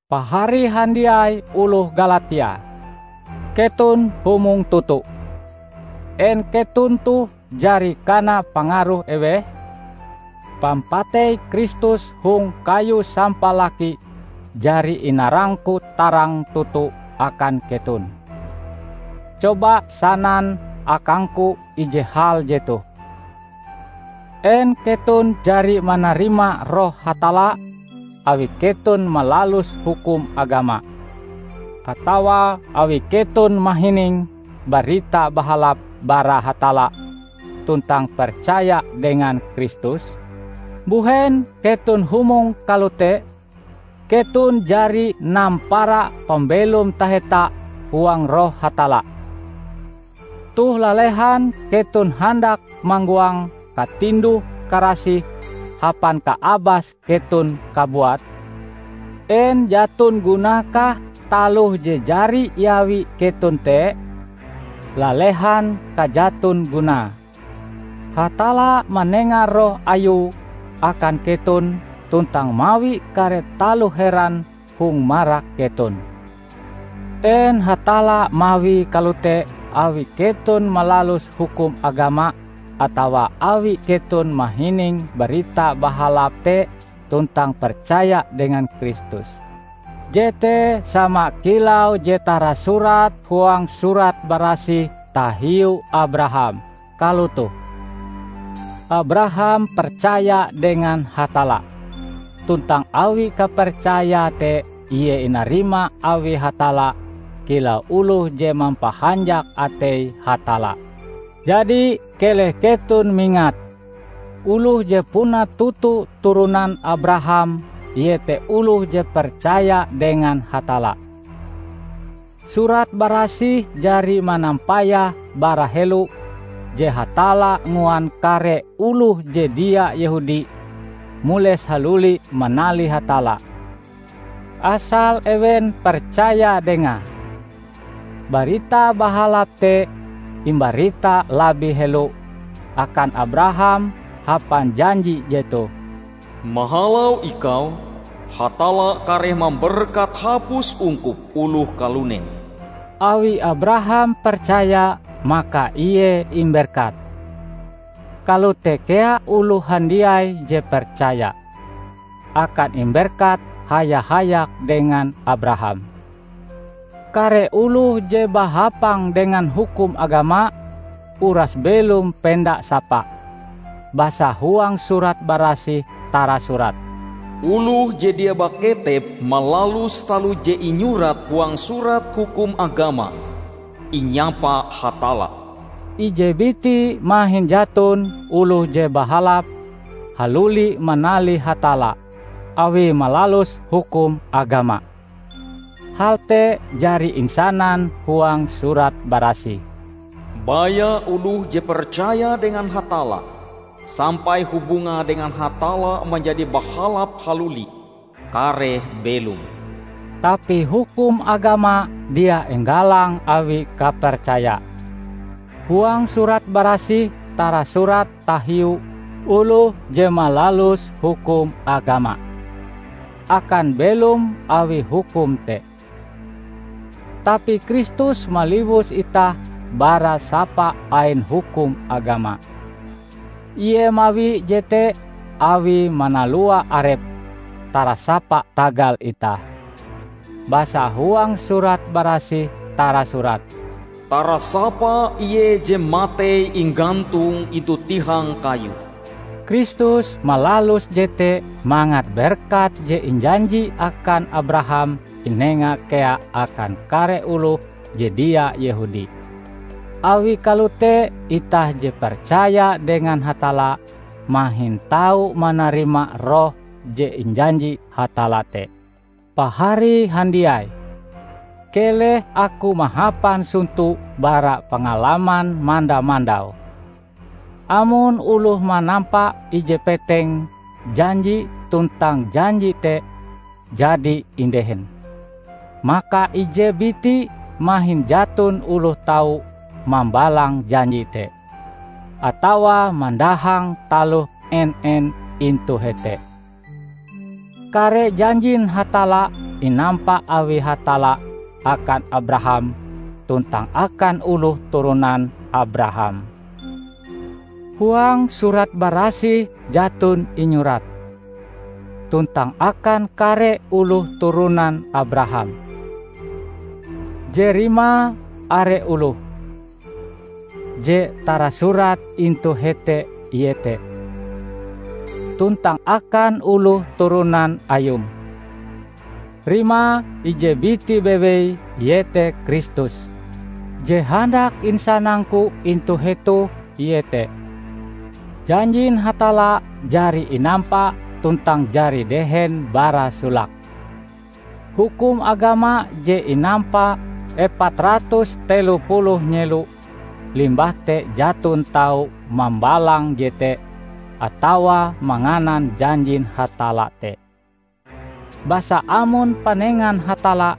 Pahari handiai oloh Galatia! Keton humong toto! En keton toh jari kana pangaruh eweh? Pampatei Kristus hong kayu sampalaki jari inarangku tarang toto akan keton! Coba sanan akangku ije hal jetoh: En keton jari manarima Roh Hatalla awi keton malalus hukum agama, atawa awi keton mahining Barita Bahalap bara Hatalla tuntang percaya dengan Kristus? Mbuhen keton humong kalote? Keton jari nampara pambelom taheta huang Roh Hatalla, toh lalehan keton handak manggoang katinduh-karasih hapan kaabas keton kabuat? En jaton gunae-kah taloh je jari iawi keton te? Lalehan kajaton gunae! Hatalla manenga Roh Ayue akan keton tuntang mawi kare taloh heran hong marak keton. En Hatalla mawie kalote awi keton malalus hukum agama atawa awi keton mahining Barita Bahalap te tuntang percaya dengan Kristus? Jete sama kilau je tarasurat huang Surat Barasih tahiu Abraham -- kalotoh, "Abraham percaya dengan Hatalla, tuntang awi kapercayae te ie inarima awi Hatalla kilau oloh je mampahanjak atei Hatalla." Jadi keleh keton mingat, oloh je puna toto turonan Abraham iete oloh je percaya dengan Hatalla. Surat Barasih jari manampayah bara helo je Hatalla nguan kare oloh je dia Yehudi mules haluli manalih Hatalla, asal ewen percaya Dengae. Barita Bahalap te imbarita labih helo akan Abraham hapan janji jetoh, "Mahalau ikau, Hatalla kareh mamberkat hapus ungkup oloh kalunen." Awi Abraham percaya maka ie imberkat. Kalote kea oloh handiai je percaya, akan imberkat haya-hayak dengan Abraham. Kare oloh je bahapang dengan hukum agama, uras belom penda sapa. Basa huang Surat Barasih tarasurat, "Oloh je dia baketep malalus taloh je inyurat huang Surat Hukum Agama, inyapa Hatalla!" Ije biti mahin jaton oloh je bahalap haluli manalih Hatalla awie malalus hukum agama. Hal te jari insanan huang Surat Barasih, "Baya oloh je percaya dengan Hatalla sampai hubungae dengan Hatalla manjadi bahalap haluli, kareh belom!" Tapi hukum agama dia inggalang awi kapercaya. Huang Surat Barasih tarasurat tahiu oloh je malalus hukum agama, akan belom awi hukum te. Tapi Kristus maliwus itah bara sapa ain hukum agama. Ie mawi jete awie manalua Arepe tarasapa tagal itah. Basa huang Surat Barasih tarasurat, "Tarasapa ie je matei inggantung intu tihang kayu." Kristus malalus jete mangat berkat je injanji akan Abraham inenga kea akan kare oloh je dia Yehudi. Awi kalote itah je percaya dengan Hatalla, mahin tau manarima Roh je injanji Hatalla te. Pahari handiai! Keleh aku mahapan sonto bara pangalaman manda-mandau. Amon oloh manampa ije peteng janji tuntang janji te jadi indehen, maka ije biti mahin jaton oloh tau mambalang janji te, atawa mandahang taloh en-en intu hete. Kare janjin Hatalla inampa awi Hatalla akan Abraham tuntang akan oloh turonan Abraham. Huang Surat Barasih jaton inyurat, "tuntang akan kare oloh turonan Abraham" je rimae are oloh. Je tarasurat intu hete iete, "tuntang akan oloh turonan ayum", rimae ije biti bewei, iete Kristus. Je handak insanangku intu hetoh iete: janjin Hatalla jari inampa tuntang jari dehen bara solake. Hukum agama je inampa epat ratus telo puluh nyelo limbah te jaton tau mambalang jete atawa manganan janjin Hatalla te. Basa amon panengan Hatalla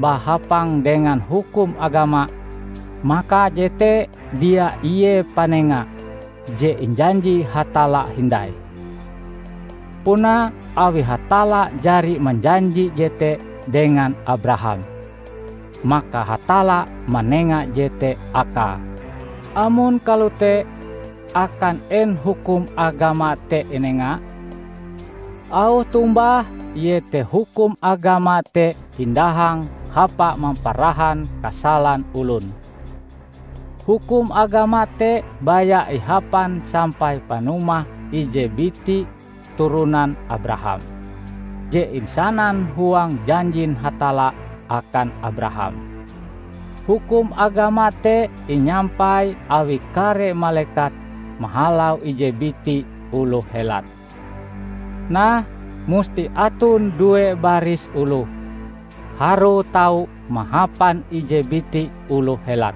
bahapang dengan hukum agama, maka jete dia ie panenga je injanji Hatalla hindai. Puna awi Hatalla jari manjanji jete dengan Abraham, maka Hatalla manenga jete akae. Amon kalote, akan en hukum agama te inenga? Auh tombahe iete hukum agama te indahang hapa mamparahan kasalan olon. Hukum agama te baya ihapan sampai panumah ije biti turonan Abraham, je insanan huang janjin Hatalla akan Abraham. Hukum agama te inyampai awi kare malekat mahalau ije biti oloh helat. Nah, musti aton due baris oloh, harue tau mahapan ije biti oloh helat.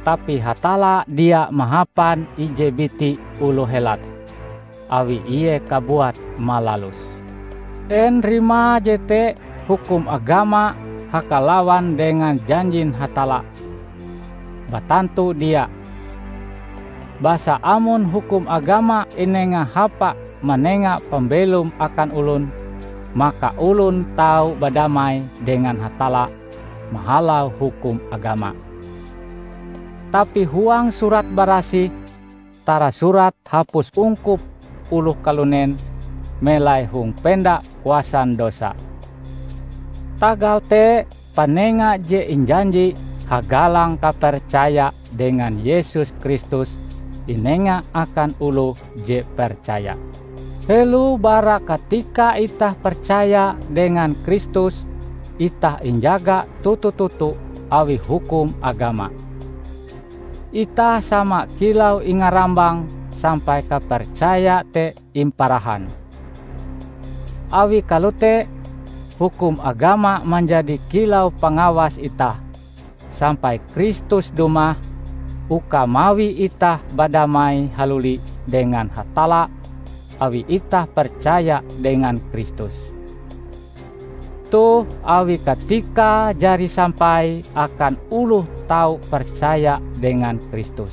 Tapi Hatalla dia mahapan ije biti oloh helat, awi Ie kabuat malaluse. En rimae jete hukum agama hakalawan dengan janjin Hatalla? Batantu dia! Basa amon hukum agama inenga hapa manenga pambelom akan olon, maka olon tau badamai dengan Hatalla mahalau hukum agama. Tapi huang Surat Barasih tarasurat hapus ungkup oloh kalunen melai hong penda kuasan dosa. Tagal te, panenga je injanji hagalang kapercaya dengan Yesus Kristus inenga akan oloh je percaya. Helo bara katika itah percaya dengan Kristus, itah injaga toto-toto awi hukum agama; itah sama kilau ingarambang sampai kapercaya te imparahan. Awi kalote, hukum agama manjadi kilau pangawas itah sampai Kristus dumah uka mawi itah badamai haluli dengan Hatalla awi itah percaya dengan Kristus. Toh, awi katikae jari sampai akan oloh tau percaya dengan Kristus,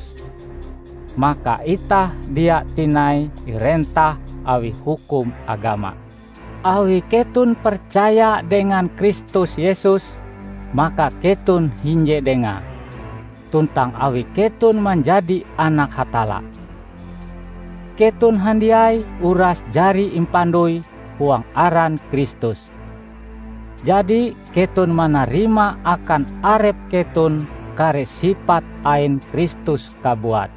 maka itah dia tinai irentah awi hukum agama. Awi keton percaya dengan Kristus Yesus, maka keton hinje Dengae; tuntang awi keton manjadi anak Hatalla. Keton handiai uras jari impandoi huang aran Kristus, jadi keton manarima akan arep keton kare sipat ain Kristus kabuat.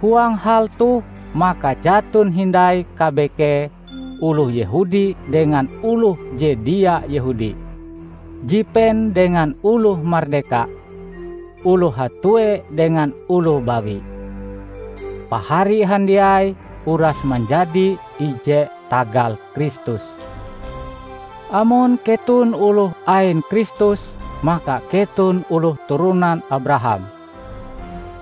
Huang hal toh maka jaton hindai kabekee oloh Yehudi dengan oloh je dia Yehudi, jipen dengan oloh mardeka, oloh hatue dengan oloh bawi. Pahari handiai uras manjadi ije tagal Kristus. Amon keton oloh ain Kristus, maka keton oloh turonan Abraham.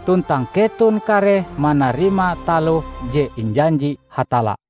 Tuntang keton kareh manarima taloh je injanji Hatalla.